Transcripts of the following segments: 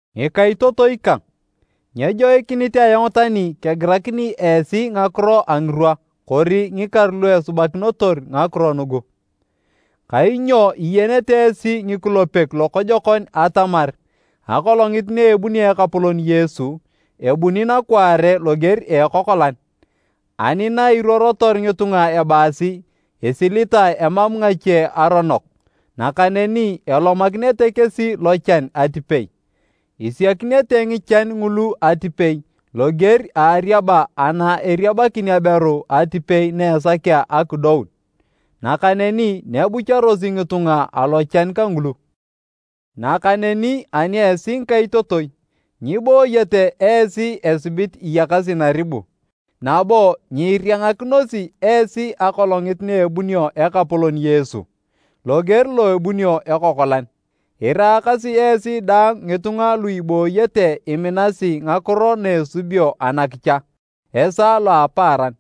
Ngikaitotoi kang, nyejoikinit ayong tani kegirakini esi ngakiro a ngirwa kori ngikaru lu esubakinotor ngakiro nugu. Kainyo iyenete esi ngikulepek lokojokon atamar Akolongit na ebunio Ekapolon Yesu, ebuni nakwaare loger a ekokolan. Ani na iruorotor ngitunga ebaasi, “Isilitae emam ngache aronok,” nakaneni elomakinete kesi lochan atipei! Isiakinete ngichan ngulu atipei loger a ariaba ana eriabakin aberu atipei na esakea akidoun, nakaneni nyebucharosi ngitunga alochan kangulu. Nakaneni ani esi ngikaitotoi, nyibooyete esi esibit iyakasi naribu, nabo nyiiriangakinosi esi Akolongit na ebunio Ekapolon Yesu, loger lo ebunio ekokolan. Iraakasi esi daang ngitunga lu ibooyete iminasi ngakiro na esubio anakicha, esaa lo a apaaran.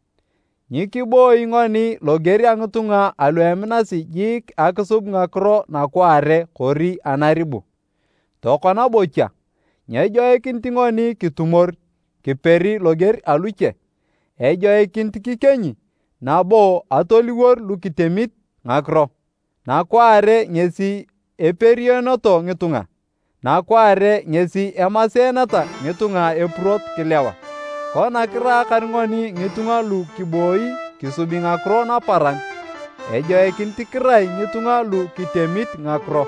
Nyikiboi ngoni loger a ngitunga alu eminasi jiik akisub ngakiro nakwaare kori anaribu. Tokona bocha, nyejoikinit ngoni kitumor kiperi loger aluche, ejoikinit kikienyi nabo atoliwor lu kitemit ngakiro. Nakwaare ngesi eperioneto ngitunga, nakwaare ngesi emaseeneta ngitunga epurot kilewa. Kona kiraakar ngoni ngitunga lu kiboi kisubi ngakiro naparan, ejoikinit kirai ngitunga lu kitemit ngakiro.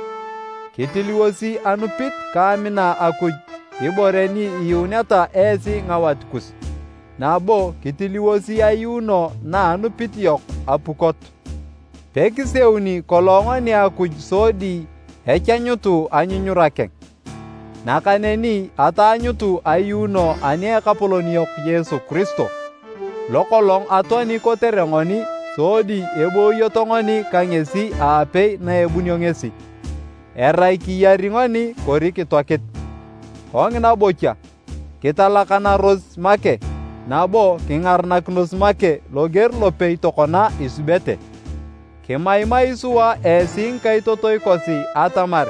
Kitiliwosi anupit ka amina Akuj, ibore ni iyuuneta esi ngawat kus, nabo kitiliwosi ayuuno na anupit yok apukot. Pekiseuni kolong ngoni Akuj sodi echanyutu anyunyura keng, nakaneni ataanyutu ayuuno ani a Ekapolon yok Yesu Kiristo, lokolong atoani kotere ngoni sodi eboyoto ngoni ka ngesi aapei na ebunio ngesi, erai kiyari ngoni kori kitoakit. Kongina bocha, kitalakanaros make nabo kingarakinos make loger lopei tokona isubete. Kimaimai sua esi ngikaitotoi kosi atamar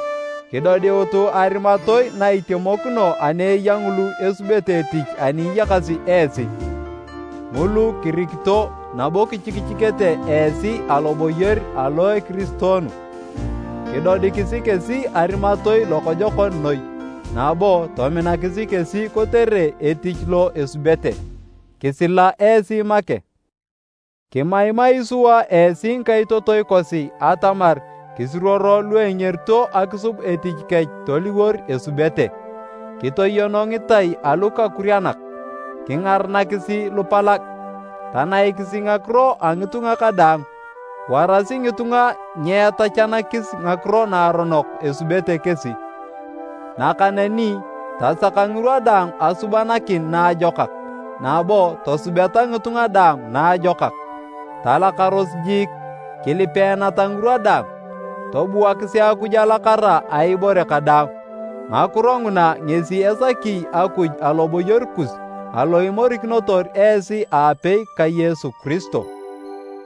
kidodiutu arimatoi na itemokino ani eya ngulu esubete etich ani iyakasi esi, ngulu kirikito nabo kichikichikete esi aloboyor alo a ekiristoonu. Kidodikisi kesi arimatoi lokojokon noi nabo tominakisi kesi kotere etich lo esubete. Kisila esi make. Kimaimai sua esi ngikaitotoi kosi atamar kisuruoro lu engerito akisub etich kech toliwor esubete, kitoyono ngitai alukakurianak, kingaranakisi lupalag, tanaikisi ngakiro a ngitunga kadaang. Warasi ngitunga nyeetachanakis ngakiro naaronok esubete kesi, nakaneni tasaka ngirwa daang asubanakin naajokak nabo tosubeta ngitunga daang naajokak. Talakaros jiik, kilipeeneta ngirwa daang, tobuakisi Akuj alakara a ibore kadaang. Ngakiro nguna ngesi esaki Akuj aloboyor kus alo imorikinotor esi aapei ka Yesu Kiristo.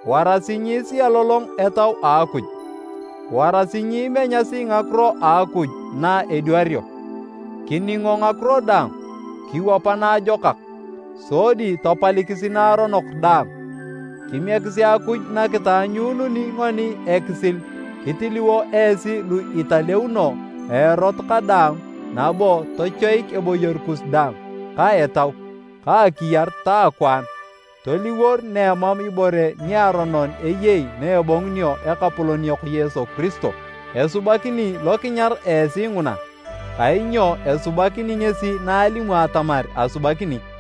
Warasi nyiisialolong Etau a Akuj, warasi nyiimenyasi ngakiro a Akuj na edwario. Kiningo ngakiro daang, kiwapa naajokak, sodi tapalikis naaronok daang. Kimiekisi Akuj na kitaanyuununi ngoni ekisil kitiliwo esi lu italeuno a erot kadaang nabo tochoik eboyor kus daang, ka etau, ka akiyar ta akwaan toliwor na emam ibore niaronon eyei na ebongunio Ekapolon yok Yesu Kiristo. Esubakini lokinyar esi nguna, kainyo esubakini ngesi na alimu atamar asubakini.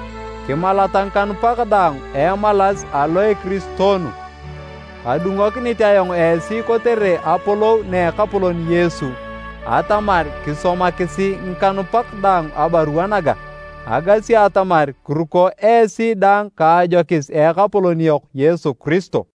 Kimalata ngikanupak daang a emalas alo a ekiristoonu. Kadungokinit ayong esi kotere apolou na Ekapolon Yesu atamar kisomakisi ngikanupak daang abarua naga. Agasi atamar kiruko esi daang ka ajokis a Ekapolon yok Yesu Kiristo.